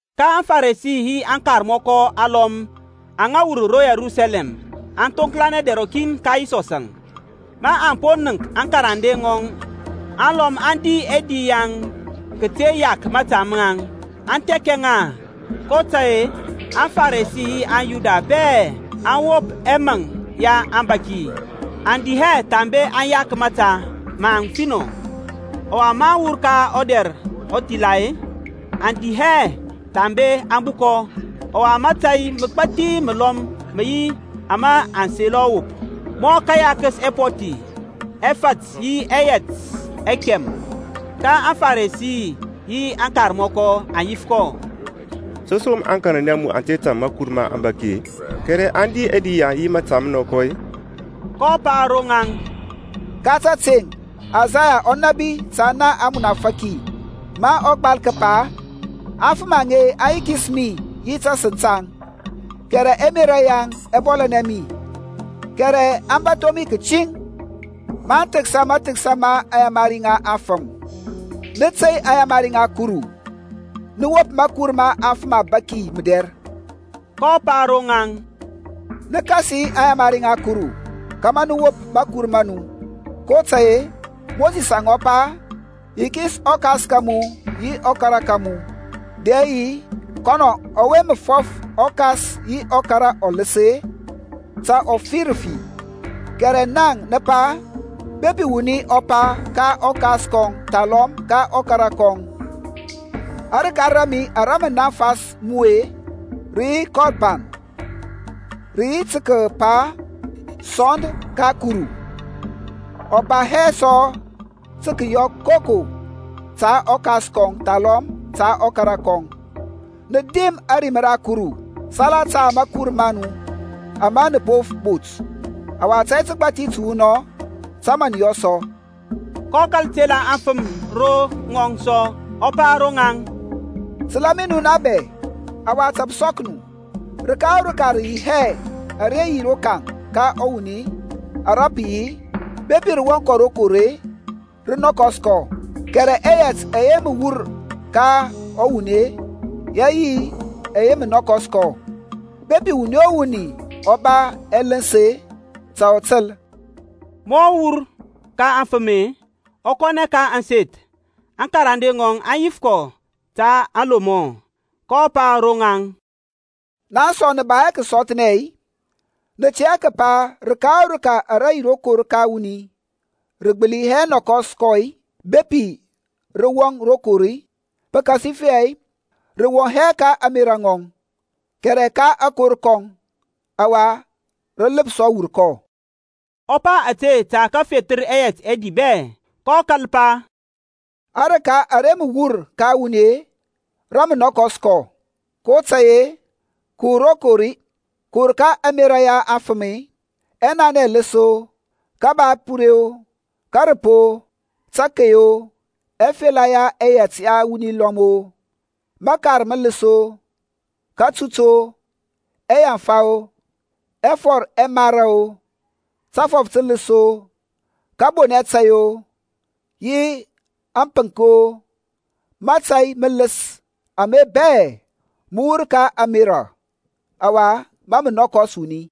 Ka aŋFarisi yi aŋkarmɔkɔ alɔm aŋa wur ro Yerusalɛm aŋ thoŋklanɛ dɛr rɔkin ka Yisɔsȧŋ, aŋ po nənk aŋkarande ŋɔŋ alɔm aŋ di ɛdi yaŋ kəte yak mȧta maŋ, aŋ thɛkɛ ŋa. kotȧy-e aŋFarisi yi aŋYuda bɛ aŋ wop ɛmaŋ ya aŋbȧki, aŋ di hɛ thambe aŋ yak mȧta maŋ finɔ. Ɔwa, maŋ wur ka ɔdɛr ɔthila-e, aŋ di hɛ thambe aŋ bukɔ, ɔwa mȧtȧy məgbathi məlɔm mə yi ama aŋ selɔ wop, mɔ kayakəs ɛpɔthi, ɛfȧt yi ɛyɛt ɛkɛm. Ka aŋFarisi yi aŋkarmɔkɔ aŋ yif kɔ, To som aŋkarande a mu aŋ te tȧŋ makur ma aŋbȧki-e, kɛrɛ aŋ di ɛdi yaŋ yi məta mənɔkɔ-e? kɔ pa ro ŋaŋ, Ka tȧteŋ Isaya ɔ nȧbi ta na amunafaki ma ɔ gbal kəpa, Aŋfəm aŋe aŋ yikis mi yi tasəŋ taŋ, Kɛrɛ ɛmerȧ yaŋ ɛ bɔlȧnɛ mi; Kɛrɛ aŋ bȧtho mi kətiŋ, Maŋ thəksa mathəksa ma aŋyamari ŋa afəm. Nə tey aŋyamari ŋa Kuru, nə wop makur ma afəm ɔbaki mədɛr. kɔ pa ro ŋaŋ, Nə kasi aŋyamari ŋa Kuru kȧmȧ nə wop makur ma nu. kotȧy-e Mosisȧŋ ɔ po pa, Yikis ɔkas ka mu yi ɔkara ka mu, dɛ yi, Kɔnɔ ɔwe mə fɔf ɔkas yi ɔkara ɔləs-e, ta ɔ fi rafi, kɛrɛ naŋ nə pa, Bepi wuni ɔ pa ka ɔkas kɔŋ thalɔm ka ɔkara kɔŋ, Arəka ra mi ara mə naŋfas mu-e rə yi Kɔrban, (rə yi tə kəpa-e, Sɔnd ka Kuru) ɔ ba hɛ sɔ tə kəyɔ koko ta ɔkas kɔŋ thalɔm ta ɔkara kɔŋ. Nə dim ȧrim ra Kuru salata mȧkur ma nu ama nə po bot. Ɔwa tȧy təgbȧthi təwunɔŋ tə mə nə yɔ sɔ. kɔ kȧl tela aŋfəm ro ŋɔŋ sɔ, ɔ pa ro ŋaŋ, Təla mi nu na bɛ, ɔwa ta pə sɔk nu. Rəka o rəka rə yi hɛ ara yi rokaŋ ka wuni ara pə yi-e, bepi rə wɔŋ kɔ rokor-e, rə nɔkɔs kɔ; kɛrɛ ɛyɛt ɛyɛ mə wur ka ɔwuni-e, yə yi ɛyɛ mə nɔkɔs kɔ. Bepi wuni o wuni ɔ ba ɛləns-e, ta ɔ təl. Ma ɔ wur ka aŋfəm-e, ɔ kɔnɛ ka ȧŋseth, aŋkarande ŋɔŋ aŋ yif kɔ ta aŋlomɔ. kɔ pa ro ŋaŋ, Naŋ sɔ nə ba hɛ kəsɔthnɛ-i? Nə tɛ hɛ kəpa rəka o rəka ara yi rokaŋ ka wuni rə gbəli hɛ nɔkɔs kɔ-i bepi rə wɔŋ kɔ rokor-i? Pəkasifɛ rə wɔŋ hɛ ka ȧŋmerȧ ŋɔŋ, kɛrɛ ka akor kɔŋ, ɔwa rə ləpsɔ wur kɔ. Ɔ pa ȧte tə kəfethər ɛyɛt ɛdi bɛ. kɔ kȧl pa, Arəka ara mə wur ka wuni-e, rə mə nɔkɔs kɔ. kotȧy-e, kəwur rokor-e, kəwur ka ɛmerȧ ya aŋfəm-e, ɛnanɛ ɛləs-o, kəba ɛpure-o, kȧrəp-o, tȧkey-o, afela ŋa yɛt ya wuni lɔm-o, məkar mələs-o, kȧtut-o, ɛyanfa-o, ɛfɔr ɛmara-o, tȧfɔf tələs-o, kȧbonɛ tȧy-o, yi ȧŋpənk-o; mȧtȧy mələs ame bɛ mə wur ka ȧŋmerȧ, ɔwa mȧ mə nɔkɔs wuni.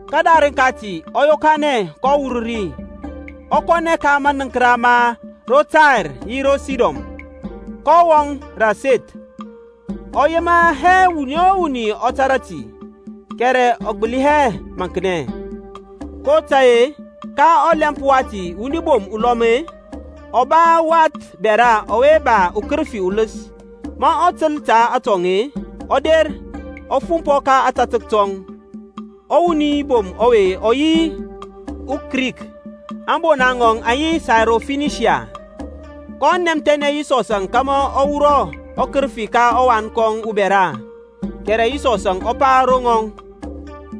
Kədarəŋ kati ɔ yokanɛ kɔ wur ri, ɔ kɔnɛ ka manəŋkəra ma ro Tair yi ro Sidon. Kɔ wɔŋ rə aseth, ɔ yema hɛ wuni o wuni ɔ tȧrȧ ti, kɛrɛ ɔ gbəli hɛ maŋknɛ. kotȧy-e ka ɔlɛmp wati wuni bom ulɔm-e, ɔ ba wath bɛra ɔwe ba ukərəfi uləs, ma ɔ təl ta atɔŋ-e, ɔ der, ɔ fumpɔ ka ȧtȧtək tɔŋ. Ɔwuni bom ɔwe ɔ yi uKrik, ȧŋbona ŋɔŋ ŋə yi uSairofinisiyan; kɔ nɛmthɛnɛ Yisɔsȧŋ kȧmȧ ɔ wurɔ ɔkərəfi ka ɔwan kɔŋ ubɛra. Kɛrɛ Yisɔsȧŋ ɔ pa ro ŋɔŋ,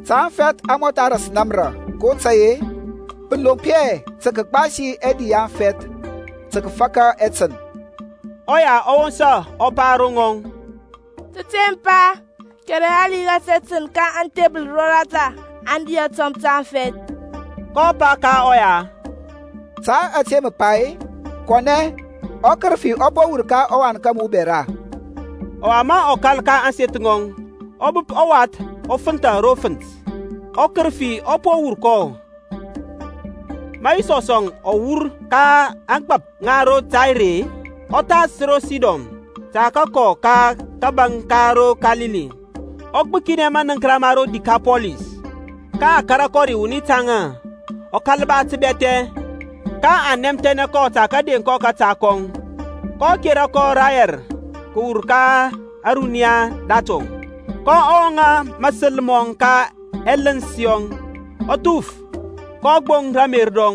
Ta aŋfɛth aŋ mɔtha ras namra, kotȧy-e pə lomp hɛ tə kəgbasi ɛdi ya aŋfɛth tə kəfaka ɛtən. Ɔya ɔ wosa ɔ pa ro ŋɔŋ, Tȧteŋ Pa, kɛrɛ hali ras ɛtən ka aŋthebəl roratha aŋ di atɔmp ta aŋfɛth. kɔ pa ka ɔya, Ta ȧte mə pa-e, kɔnɛ, ɔkərəfi ɔ po wur ka ɔwan ka mu ubɛra. Ɔwa ma ɔ kȧl ka ȧŋseth ŋɔŋ, ɔ bəp ɔwath ɔ fənthȧ ro fənt, ɔkərəfi ɔ po wur kɔ. Ma Yisɔsȧŋ ɔ wur ka ȧŋgbȧp ŋa ro Tair-e, ɔ thas ro Sidon tə kəkɔ ka kȧbȧŋ ka ro Kalili, ɔ gbəkinɛ manəŋkəra ma ro Dikapɔlis. Ka a kȧrȧ kɔ ri wuni taŋa, ɔ kȧl ba təbɛthɛ; ka aŋ nɛmthɛnɛ kɔ tə kədeŋ kɔ kȧta kɔŋ. kɔ kera kɔ rayɛr kəwur ka ȧruniya datɔŋ, kɔ wɔŋȧ mȧsəl mɔŋ ka ɛləns yɔŋ, ɔ thuf, kɔ gboŋ ramer rɔŋ.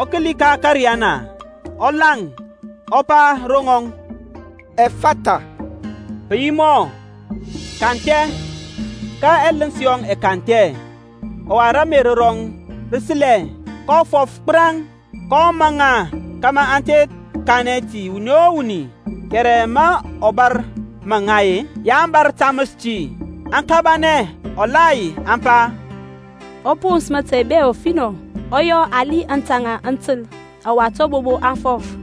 Ɔ kəli ka ȧkȧriyana, ɔ laŋ, ɔ pa ro ŋɔŋ, Ɛfatha, pə yi mɔ, Kanthɛ. Ka ɛləns yɔŋ ɛ kanthɛ, ɔwa ramer rɔŋ rə səlɛ, kɔ fɔf gbəraŋ. kɔ ma ŋa kȧmȧ aŋ te kanɛ ti wuni o wuni, kɛrɛ ma ɔ bȧr maŋ ŋa, ya aŋ bȧr taməs ti. Aŋ kabanɛ ɔthasar aŋ pa, Ɔ pons mȧtȧy bɛ ɔfinɔ, ɔ yɔ hali aŋtȧŋȧ aŋ təl, ɔwa tabobo aŋ fɔf.